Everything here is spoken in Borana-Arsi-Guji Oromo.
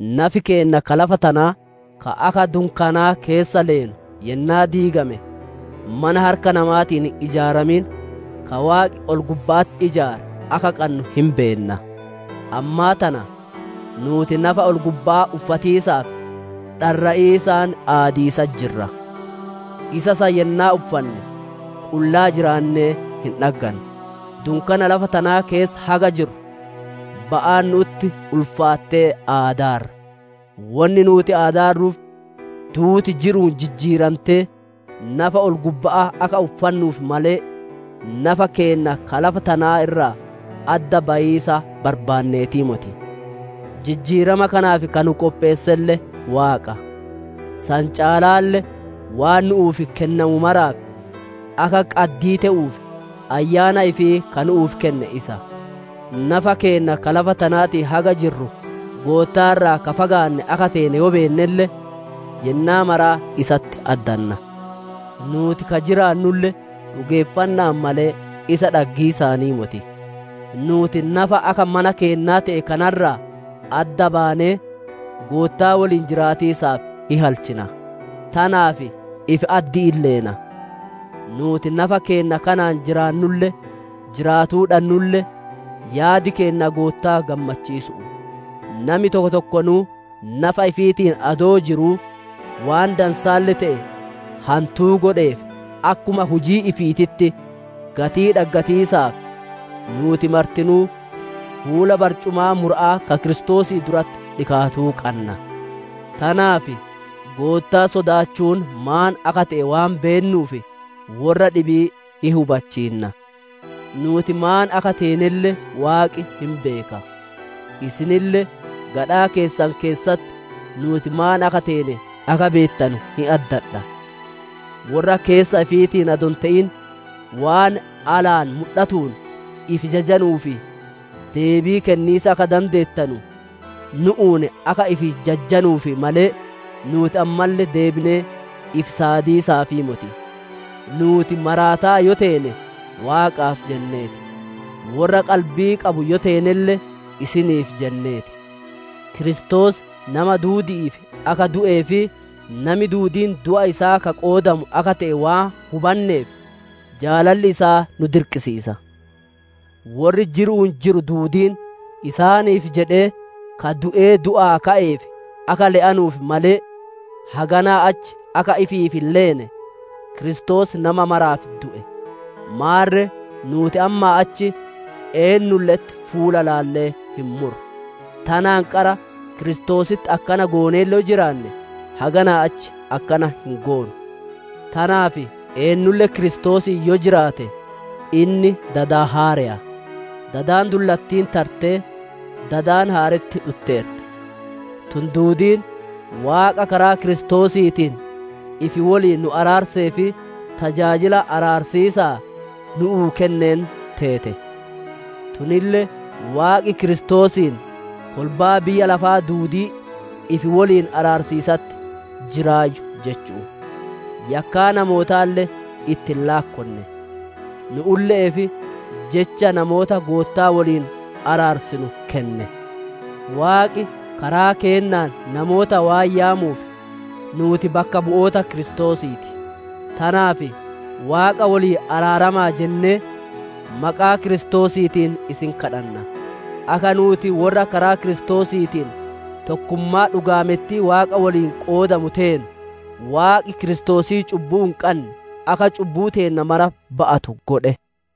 Nafi keenna ka lafa tanaa, ka akka dunkaani'ii keessa leenu yennaa diigame, mana harka namaatiin hin ijaaramin, ka Waaqi ol-gubba'atti ijaare akka qannu hin beenna. Ammaa tana nuuti nafa ol-gubba'aa uffatiisaaf dharra'iisaan aadiisatti jirra. Isa san yennaa uffanne qullaa jiraannee hin dhaggannu. Dunkaana lafa tanaa keessa haga jirru, ba'aan nu'utti ulfaattee aadaarra; wonni nuuti aadaarruuf duuti jiru'uun jijjiirantee, nafa ol-gubba'aa akka uffannuuf malee, nafa keenna ka lafa tanaa irraa adda bayiisa barbaanneetii moti. Jijjiirama kanaaf ka nu qopheesselle Waaqa; san caalaalle waan nu'uuf kennamu maraaf akka qaddii te'uuf, ayyaana ifii ka nu'uuf kenne isa. Nafa keenna ka lafa tanaatiin haga jirru, Goottaa irraa ka fagaanne akka teene yoo beennelle, yennaa maraa isatti addanna. Nuuti ka jiraannulle dhugeeffanna'aan malee, isa dhaggiisaanii moti. Nuuti nafa akka mana keennaa te'e kana irraa adda baanee, Goottaa woliin jiraatiisaaf hin halchina; tanaaf ifi addi'iin leena. Nuuti nafa keenna kanaan jiraannulle, jiraatuu dhannulle, yaadi keenna Goottaa gammachiisu'u. Nami tokko tokkonuu nafa ifiitiin adoo jiruu, waan dansaalle te'e hantuu godheef, akkuma hujii ifiititti gatii dhaggatiisaaf, nuuti martinuu fuula barcumaa mura'aa ka Kiristoosii duratti dhikaatuu qanna. Tanaaf Goottaa sodaatiis maan akka te'e waan beennuuf, worra dhibii hin hubachiinna. Nuuti maan akka teenelle Waaqi hin beeka; isinille gadhaa keessan keessatti nuuti maan akka teene akka beettanu hin addadha. Worra keessa ifiitiin adoo hin te'in, waan alaan mudhatuun ifi jajanuuf deebii kenniisa akka dandeettanu, nu'uun akka ifi jajjanuuf malee, nuuti ammalle deebinee ifi saadiisaafii moti. Nuuti maraataa yoo teene Waaqaaf jennee ti; worra qalbii qabu yoo teenelle isiniif jennee ti. Kiristoos nama duudi'iif akka du'ee fi nami duudiin du'a isaa ka qoodamu akka te'e waan hubanneef, jaalalli isaa nu dirqansiisa. Worri jiru'uun jiru duudiin, isaaniif jedhee ka du'ee du'aa ka'eef akka le'anuuf malee, haganaa achi akka ifiif hin leene, Kiristoos nama maraaf du'e. Maarre nuuti ammaa achi eennulle'etti fuula ilaallee hin murru. Tanaan qara Kiristoositti akkana gooneelle yoo jiraanne, haganaa achi akkana hin goonu. Tanaaf eennulle Kiristoosiin yoo jiraate inni dada haareya; dadi dullattiin tartee, dadi haaretti dhutteerti. Tun duudiin Waaqa karaa Kiristoosiitiin ifi woliin nu araarsee fi tajaajila araarsiisaa nu'uu kenneen teete. Tunille Waaqi Kiristoosiin kolbaa biyya lafaa duudii ifi woliin araarsiisatti jiraayyu jechu'u; yakkaa namootaalle itti hin laakkonne; nu'ulle'eef jecha namoota Goottaa woliin araarsinu kenne. Waaqi karaa keennaan namoota waan yaamuuf, nuuti bakka bu'oota Kiristoosii ti; tanaaf, «Waaqa woliin araarama'a» jennee maqaa Kiristoosiitiin isin kadhanna. Akka nuuti worra karaa Kiristoosiin tokkummaa dhugaamettii Waaqaa woliin qoodamu teenu, Waaqi Kiristoosii cubbuu hin qanne, akka cubbuu teenna mara ba'atu godhe.